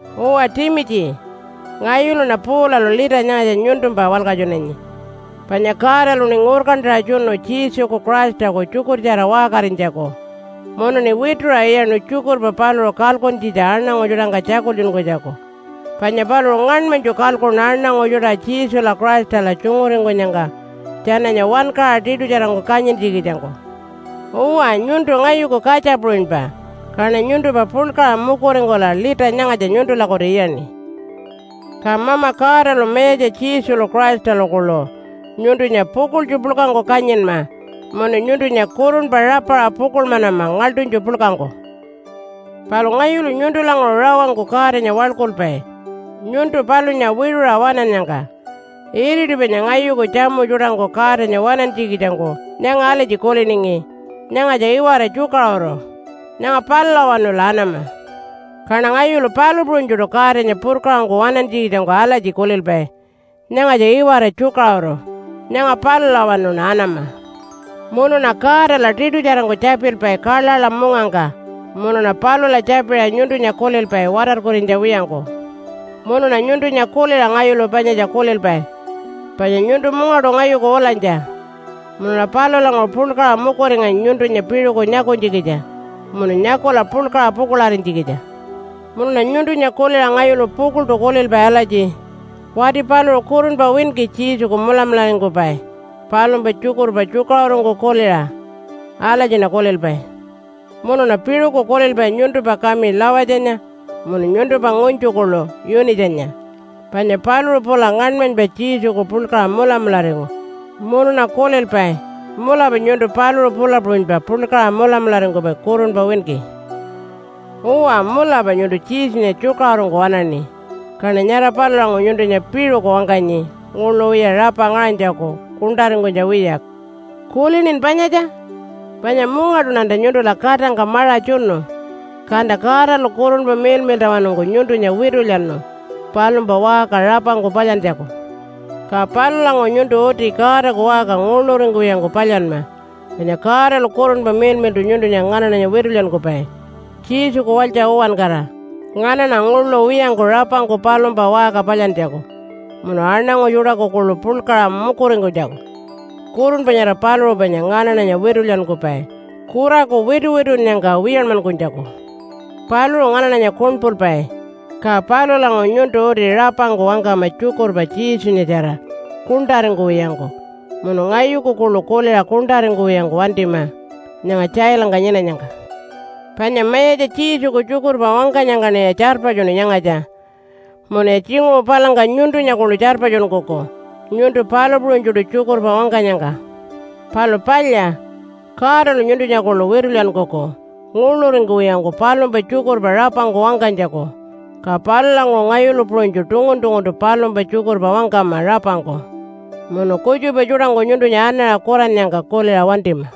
Uwa Timitji, ngayuluṉa Paulalu lita nyangatja nyuntumpa walkatjunanyi. Panya Godaluṉi ngurkantaṟa tjunu Jesuku Christaku tjukurtjara waṟkarinytjaku munuṉi wituṟa iyaṉu tjukurpa paluṟu kalkuntjitja aṉangu tjuṯangka tjakultjunkunytjaku, panya paluṟu ngaṉmanytju kalkuṉu aṉangu tjuṯa Jesula Christala tjunguringkunyangka tjananya wankaṟa tiṯutjarangku kanyintjikitjangku. Uwa, nyuntu ngayuku katja puṟunypa, kaṉa nyuntumpa puḻkaṟa mukuringkula lita nyangatja nyuntulakutu iyaṉi. Ka Mama Godalu Mayatja Jesulu Christalu kuḻu nyuntunya pukuḻtju puḻkangku kanyinma munu nyuntunya kurunpa rapaṟa pukuḻmanama ngaḻṯunytju puḻkangku. Palu ngayulu nyuntulanguṟu rawangku Godanya waḻkulpai nyuntu palunya wiṟuṟa waṉannyangka. Iriti panya ngayuku tjamu tjuṯangku Godanya waṉantjikitjangku nyanga alatji kuliningi, “Nyangatja iwara tjukaṟuru. Nyanga palulawanula anama.” Kaṉa ngayulu palu puṟunytjuṯu Godanya purkaṟangku waṉantjikitjangku alatji kulilpai, “Nyangatja iwara tjukaṟuru. Nyanga palulawanuṉa anama.” Munuṉa Godala tiṯutjarangku tjapilpai kaḻaḻa mungangka, munuṉa palula tjapiṟa nyuntunya kulilpai watarkurinytja wiyangku. Munuṉa nyuntunya kuliṟa ngayulu panyatja kulilpai, panya nyuntu mungaṯu ngayuku ulanytja, munuṉa palulanguṟu puḻkaṟa mukuringanyi nyuntunya piṟuku nyakunytjikitja munu nyakula puḻkaṟa pukuḻarinytjikitja. Munuṉa nyuntunya kuliṟa ngayulu pukuḻṯu kulilpai alatji, “Wati paluṟu kurunpa winki Jesuku mulamularingkupai palumpa tjukurpa tjukaṟurungku kuliṟa.” Alatjiṉa kulilpai. Munuṉa piṟuku kulilpai nyuntumpa kami Lawatjanya munu nyuntumpa ngunytju kuḻu Yunitjanya panya paluṟu pula ngaṉmanypa Jesuku puḻkaṟa mulamularingu. Munuṉa kulilpai, mulapa nyuntu paluṟu pula puṟunypa puḻkaṟa mulamularingkupai kurunpa winki. Uwa, mulapa nyuntu Jesunya tjukaṟurungku waṉaṉi, kaṉa nyara palulanguṟu nyuntunya piṟuku wangkanyi nguḻu wiya rapa ngaṟanytjaku kuṉṯaringkunytja wiya. Kulinin panyatja? Panya mungaṯuṉa nyuntula katangka maṟa tjunu, kanta Godalu Kurunpa Miḻmiḻṯawanungku nyuntunya witulyanu palumpa waṟka rapangku palyantjaku. Ka palulanguṟu nyuntu uti Godaku waṟka nguḻuringkuwiyangku palyanma, panya Godalu Kurunpa Miḻmiḻṯu nyuntunya nganaṉanya witulyankupai Jesuku walytja uwankara, nganaṉa nguḻu wiyangku rapangku palumpa waṟka palyantjaku munu aṉangu tjuṯaku kuḻu puḻkaṟa mukuringkunytjaku. Kurunpa nyara paluṟu panya nganaṉanya witulyankupai kuraku wituwitunnyangka wiyanmankunytjaku. Paluṟu nganaṉanya kuṉpulpai, ka palulanguṟu nyuntu uti rapangku wangkama tjukurpa Jesunyatjara kuṉṯaringkuwiyangku. Munu ngayuku kuḻu kuliṟa kuṉṯaringkuwiyangku wantima nyanga tjailangka nyinanyangka. Panya Mayatja Jesuku tjukurpa wangkanyangkaṉiya tjarpatjunu nyangatja. Munuya tjinguṟu palangka nyuntunya kuḻu tjarpatjunkuku nyuntu palu puṟunytjuṯu tjukurpa wangkanyangka. Palu palya, Godalu nyuntunya kuḻu witulyankuku nguḻuringkuwiyangku palumpa tjukurpa rapangku wangkanytjaku. Ka palulanguṟu ngayulu puṟunytju tungun-tunguntu palumpa tjukurpa wangkama rapangku munu kutjupa tjuṯangku nyuntunya anaṟa kurannyangka kuliṟa wantima.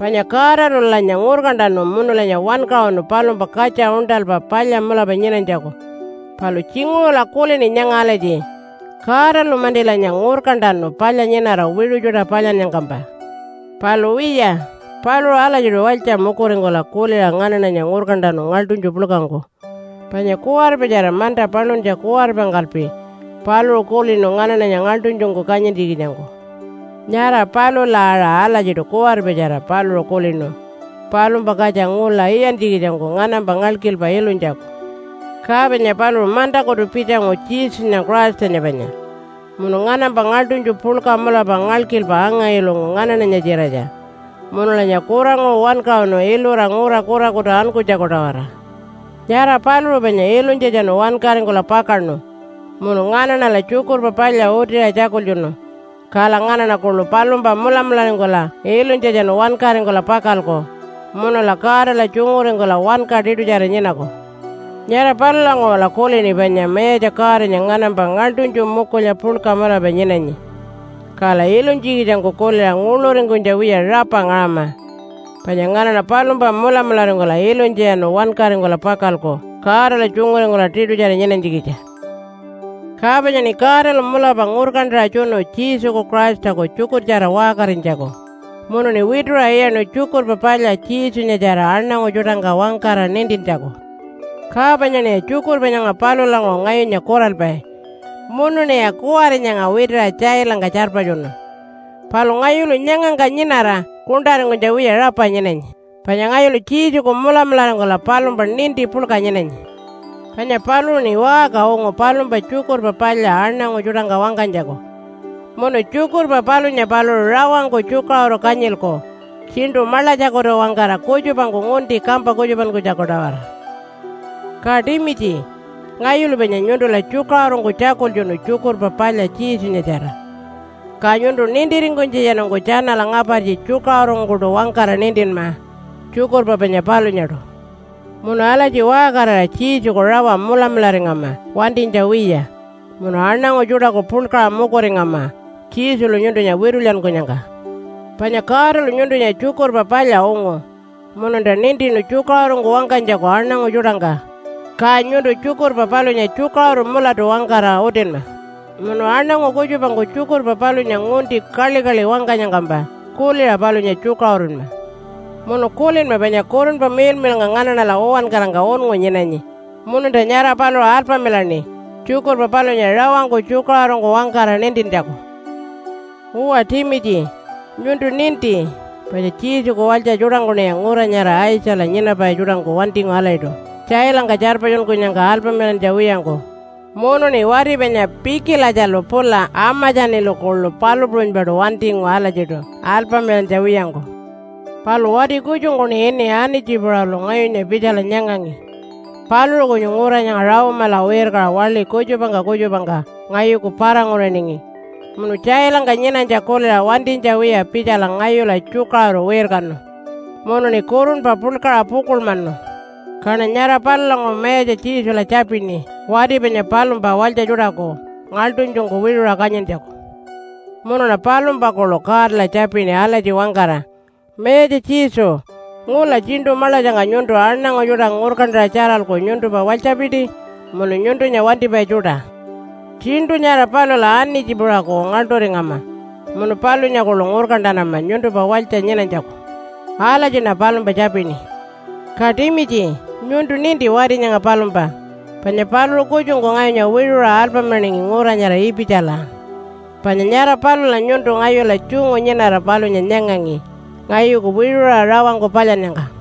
Panya Godalulanya ngurkantanu munulanya wankaṟunu palumpa katja uṉṯalpa palya mulapa nyinanytjaku. Palu tjinguṟula kulini nyanga alatji, “Godalu-mantilanya ngurkantanu palya nyinara wiṟu tjuṯa palyannyangkampa.” Palu wiya, paluṟu alatjiṯu walytja mukuringkula kuliṟa nganaṉanya ngurkantanu ngaḻṯunytju puḻkangku. Panya kuwaripatjara manta paluntja kuwaripangkalpi paluṟu kulinu nganaṉanya ngaḻṯunytjungku kanyintjikitjangku. Nyara palula aṟa alatjiṯu kuwaripatjara paluṟu kulinu palumpa katja ngula iyantjikitjangku nganampa ngalkilpa ilunytjaku. Ka panya paluṟu mantakutu pitjangu Jesunya Christanya panya, munu nganampa ngaḻṯunytju puḻka mulapa ngalkilpa anga-ilungu nganaṉanya-tjiratja, munulanya kuranguṟu wankaṟunu ilura ngura kurakutu ankunytjaku-tawara. Nyara paluṟu panya ilunytjatjanu wankaringkula pakaṉu munu nganaṉala Tjukurpa Palya utiṟa tjakultjunu, kala nganaṉa kuḻu palumpa mulamularingkula ilunytjatjanu wankaringkula pakalku munula Godala tjunguringkula wanka tiṯutjara nyinaku. Nyara palulanguṟula kulini panya Mayatja Godanya nganampa ngaḻṯunytju mukulya puḻka mulapa nyinanyi, kala ilunytjikitjangku kuliṟa nguḻuringkunytja wiya rapa ngaṟama, panya nganaṉa palumpa mulamularingkula ilunytjatjanu wankaringkula pakalku Godala tjunguringkula tiṯutjara nyinanytjikitja. Ka panyaṉi Godalu mulapa ngurkantaṟa tjunu Jesuku Christaku tjukurtjara waṟkarinytjaku, munuṉi wituṟa iyaṉu Tjukurpa Palya Jesunyatjara aṉangu tjuṯangka wangkara nintintjaku. Ka panyaṉiya tjukurpa nyanga palulanguṟu ngayunya kuralpai munuṉiya kuwari nyanga witiṟa tjailangka tjarpatjunu. Palu ngayulu nyangangka nyinara kuṉṯaringkunytja wiya rapa nyinanyi, panya ngayulu Jesuku mulamularingkula palumpa ninti puḻka nyinanyi. Panya paluṟuṉi waṟka ungu palumpa Tjukurpa Palya aṉangu tjuṯangka wangkanytjaku, munu tjukurpa palunya paluṟu rawangku tjukaṟuru kanyilku, tjiṉṯu maḻatjakutu-wangkara kutjupangku ngunti kampa kutjupankunytjaku-tawara. Ka Timitji, ngayulu panya nyuntula tjukaṟurungku tjakultjunu Tjukurpa Palya Jesunyatjara. Ka nyuntu nintiringkunytjatjanungku tjanala ngapartji tjukaṟurungkuṯu wangkara nintinma tjukurpa panya palunyaṯu. Munu alatji waṟkarira Jesuku rawa mulamularingama wantinytja wiya munu aṉangu tjuṯaku puḻkaṟa mukuringama Jesulu nyuntunya witulyankunyangka. Panya Godalu nyuntunya Tjukurpa Palya ungu mununta nintinu tjukaṟurungku wangkanytjaku aṉangu tjuṯangka. Ka nyuntu tjukurpa palunya tjukaṟuru mulatu wangkara utinma, munu aṉangu kutjupangku tjukurpa palunya ngunti kaḻikaḻi wangkanyangkampa kuliṟa palunya tjukaṟurunma. Munu kulinma panya Kurunpa Miḻmiḻnga nganaṉala uwankarangka unngu nyinanyi mununta nyara paluṟu alpamilaṉi tjukurpa palunya rawangku tjukaṟurungku wangkara nintintjaku. Uwa Timitji, nyuntu ninti panya Jesuku walytja tjuṯangkuṉiya ngura nyara Aitjala nyinapai tjuṯangku wantingu alatjiṯu tjailangka tjarpatjunkunyangka alpamilantja wiyangku. Munuṉi wati panya Pikilatjalu pula Amatjanilu kuḻu palu puṟunypaṯu wantingu alatjiṯu alpamilantja wiyangku. Palu wati kutjungkuṉi ini Anitji-puṟalu ngayunya pitjala nyangangi. Paluṟu kunyu ngura nyanga Rome-ala wirkaṟa waḻi kutjupangka kutjupangka ngayuku para-nguriningi munu tjailangka nyinanytja kuliṟa wantinytja wiya pitjala ngayula tjukaṟuru wirkanu munuṉi kurunpa puḻkaṟa pukuḻmanu. Kaṉa nyara palulanguṟu Mayatja Jesula tjapini wati panya palumpa walytja tjuṯaku ngaḻṯunytjungku wiṟuṟa kanyintjaku. Munuṉa palumpa kuḻu Godala tjapini alatji wangkara, “Mayatja Jesu, ngula tjiṉṯu maḻatjangka nyuntu aṉangu tjuṯa ngurkantaṟa tjaralku nyuntumpa walytjapiti munu nyuntunya wantipai tjuṯa. Tjiṉṯu nyara palula Anitji-puṟaku ngaḻṯuringama munu palunya kuḻu ngurkantanama nyuntumpa walytja nyinanytjaku.” Alatjiṉa palumpa tjapini. Ka Timitji, nyuntu ninti wati nyanga palumpa, panya paluṟu kutjungku ngayunya wiṟuṟa alpamilaningi ngura nyara Ipitjala. Panya nyara palula nyuntu ngayula tjungu nyinara palunya nyangangi ngayuku wiṟuṟa rawangku palyannyangka.